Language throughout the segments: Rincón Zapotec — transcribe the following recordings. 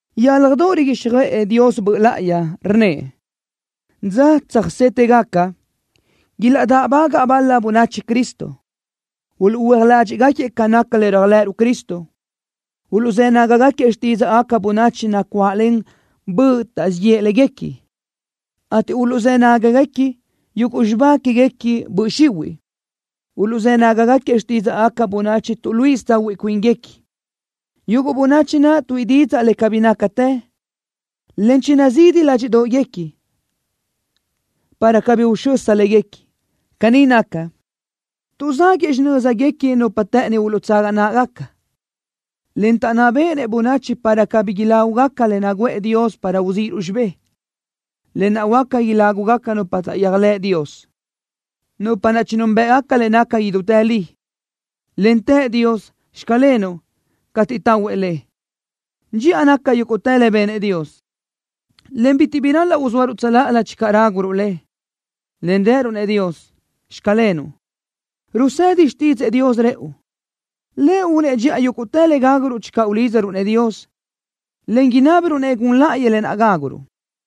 Yálajdoʼ riguíxjöʼë Dios Böʼ Láʼayi, rnnëʼ: Dza tsöjsétëgaca, ilaʼdáʼbagaʼ bal-la bönachi Cristo. Uluʼhuö́aj ládxiʼgaquiëʼ ca naca le réajlëʼëruʼ Cristo. Uluʼzë́ nágagaquiëʼ xtídzaʼgaca bönachi nacuáʼlen böʼ taʼzíʼ yëʼ léguequi, ateʼ uluʼzë́ nágagaquiëʼ yuguʼ xibá quéguequi böʼ xihuiʼ. Uluʼzë́ nágagaquiëʼ xtídzaʼgaca bönachi tuʼluíʼisö tsahuiʼ cuínguequi. Yuguʼ bönachi naʼ tuíʼi didzaʼ le cabí nácatë, en chinazidi ládxiʼdoʼguequi, para cabí uxösa léguequi. Caní naca, tuʼzáguëʼë xinö́zguequi nupa të́ʼëni uluʼtsaga náʼagaca, en taʼnná béʼenëʼ bönachi para cabí ilágugaca le naguʼë Dios para uzíʼiruʼ xibé, lë naʼ huáca ilágugaca nupa taʼyéajlëʼ Dios, nupa naʼ chinúnbëʼgaca le naca idútë li, en tëʼ Dios: “Xclenuʼ” cateʼ tahuëʼ le. Dxiʼa naca yúguʼtë le benëʼ Dios, en bitiʼ bi ral-laʼ uzóaruʼ tsöláʼalö channö ráguruʼ le, en rëruʼ-nëʼ Dios: “Xclenuʼ.” Rusedi xtídzëʼë Dios rëʼu, Lëʼ únëʼ dxiʼa yúguʼtë le gáguruʼ channö ulídzaruʼ-nëʼ Dios, en inábiruʼ-nëʼ gun láʼayëʼ lë naʼ gáguruʼ.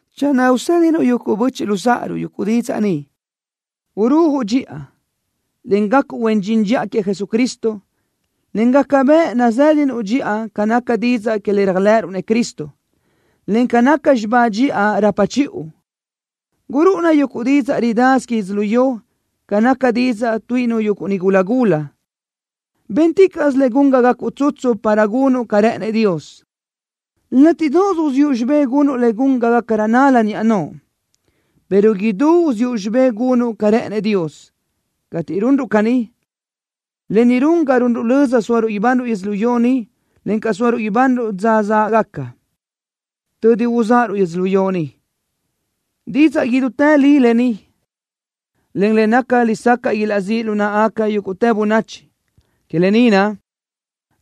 Channö usédinuʼ yuguʼ böchiʼ luzáʼaruʼ yuguʼ didzaʼ ni, urúajuʼ dxiʼa, en gacuʼ huen dxin dxiʼa queëʼ Jesucristo, en gaca bëʼ nazë́duʼ dxiʼa ca naca didzaʼ que le réajlëʼëruʼ-nëʼ Cristo, en ca naca xibá dxiʼa rapa chiʼu. Gurúʼuna yuguʼ didzaʼ ridasö que yödzölió ca naca didzaʼ tuíʼinu yuguʼ nigula gula. Bénticaʼsö le gun ga gacuʼ tsutsu para gunuʼ ca rë́ʼënëʼ Dios. Látiʼdoʼos uziʼu xibé gunuʼ le gun ga gácarö nál-la niʼa noʼo, pero idú uziʼu xibé gunuʼ ca rë́ʼënëʼ Dios. Cateʼ runruʼ caní, lë ni run ga runruʼ löza sóaruʼ ibanruʼ yödzölió ni, encaʼ sóaruʼ ibanruʼ dza záʼgaca, tödi uzáʼaruʼ yödzölió ni. Didzaʼ idútë li lë ni, en le naca lesacaʼ ilaʼzíʼ lu náʼagaca yúguʼtë bönachi. Que lë ni naʼ,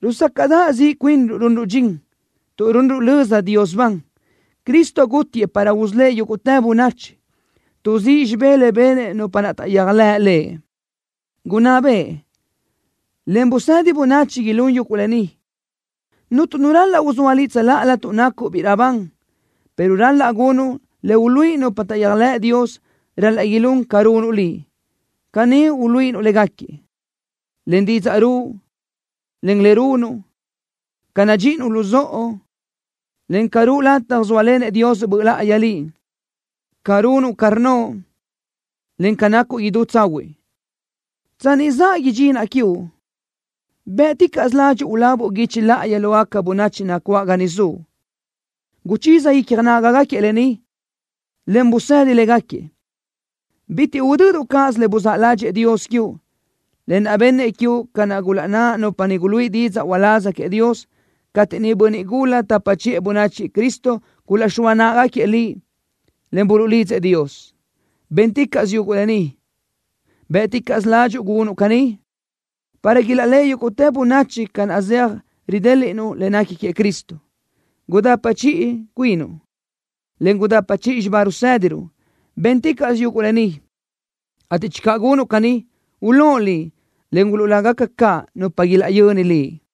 rusácaʼdaʼ ziʼ cuinruʼ runruʼ dxin, tuʼ runruʼ löza Dios ban. Cristo gútiëʼ para usölë́ʼ yúguʼtë bönachi. Tuʼzíʼ xibé le benëʼ nupa naʼ taʼyéajlëʼ Lëʼ. Gunná beʼe, en busedi bönachi ilún yuguʼ lë ni. Cuntu nu ral-laʼ uzóa liʼ tsöláʼalö tuʼ nacuʼ biʼi raʼbán, pero ral-laʼ gunuʼ le uluíʼi nupa taʼyéajlëʼ Dios ral-laʼ ilún ca runuʼ liʼ. Caní uluíʼinuʼ légaquiëʼ: Len didzaʼ ruʼu, en len le runuʼ. Ca nadxíʼinuʼ luzóʼo, en ca ruʼu lataj zóalenëʼ Dios Böʼ Láʼayi liʼ. Ca runuʼ ca rnnoʼ, en ca nacuʼ idú tsahuiʼ. Tsanni zaʼa idxinaʼ quiuʼ, bë́ʼticaʼsö ladxiʼ ulabuʼ guichi láʼayi lógaca bönachi nacuáʼ ga niʼ zuʼ. Guchiza icja nágagaquiëʼ lë ni, en busedi légaquiëʼ. Bitiʼ udöduʼ cáʼasö le buzáʼ ládxëʼë Dios quiuʼ, lë naʼ bennëʼ quiuʼ ca naʼ gulaʼnná nupa niʼ guluíʼi didzaʼ uláz queëʼ Dios, cateʼ niʼ bönniʼ gula tapa chiʼë bönachi queëʼ Cristo gulaʼxóa náʼagaquiëʼ liʼ, en buluʼlidzëʼ Dios. Bénticaʼsö yuguʼ lë ni. Bë́ʼticaʼsö ládxuʼu gunuʼ caní, para ilaʼléʼe yúguʼtë bönachi ca naʼ zeaj ridéliʼnuʼ le nequi queëʼ Cristo. Gudapa chiʼi cuinuʼ, en gudapa chiʼi xibá rusédiruʼ. Bénticaʼsö yuguʼ lë ni, ateʼ channö gunuʼ caní, ulóʼ liʼ, en uluʼlágaca caʼ nupa ilaʼyöni liʼ.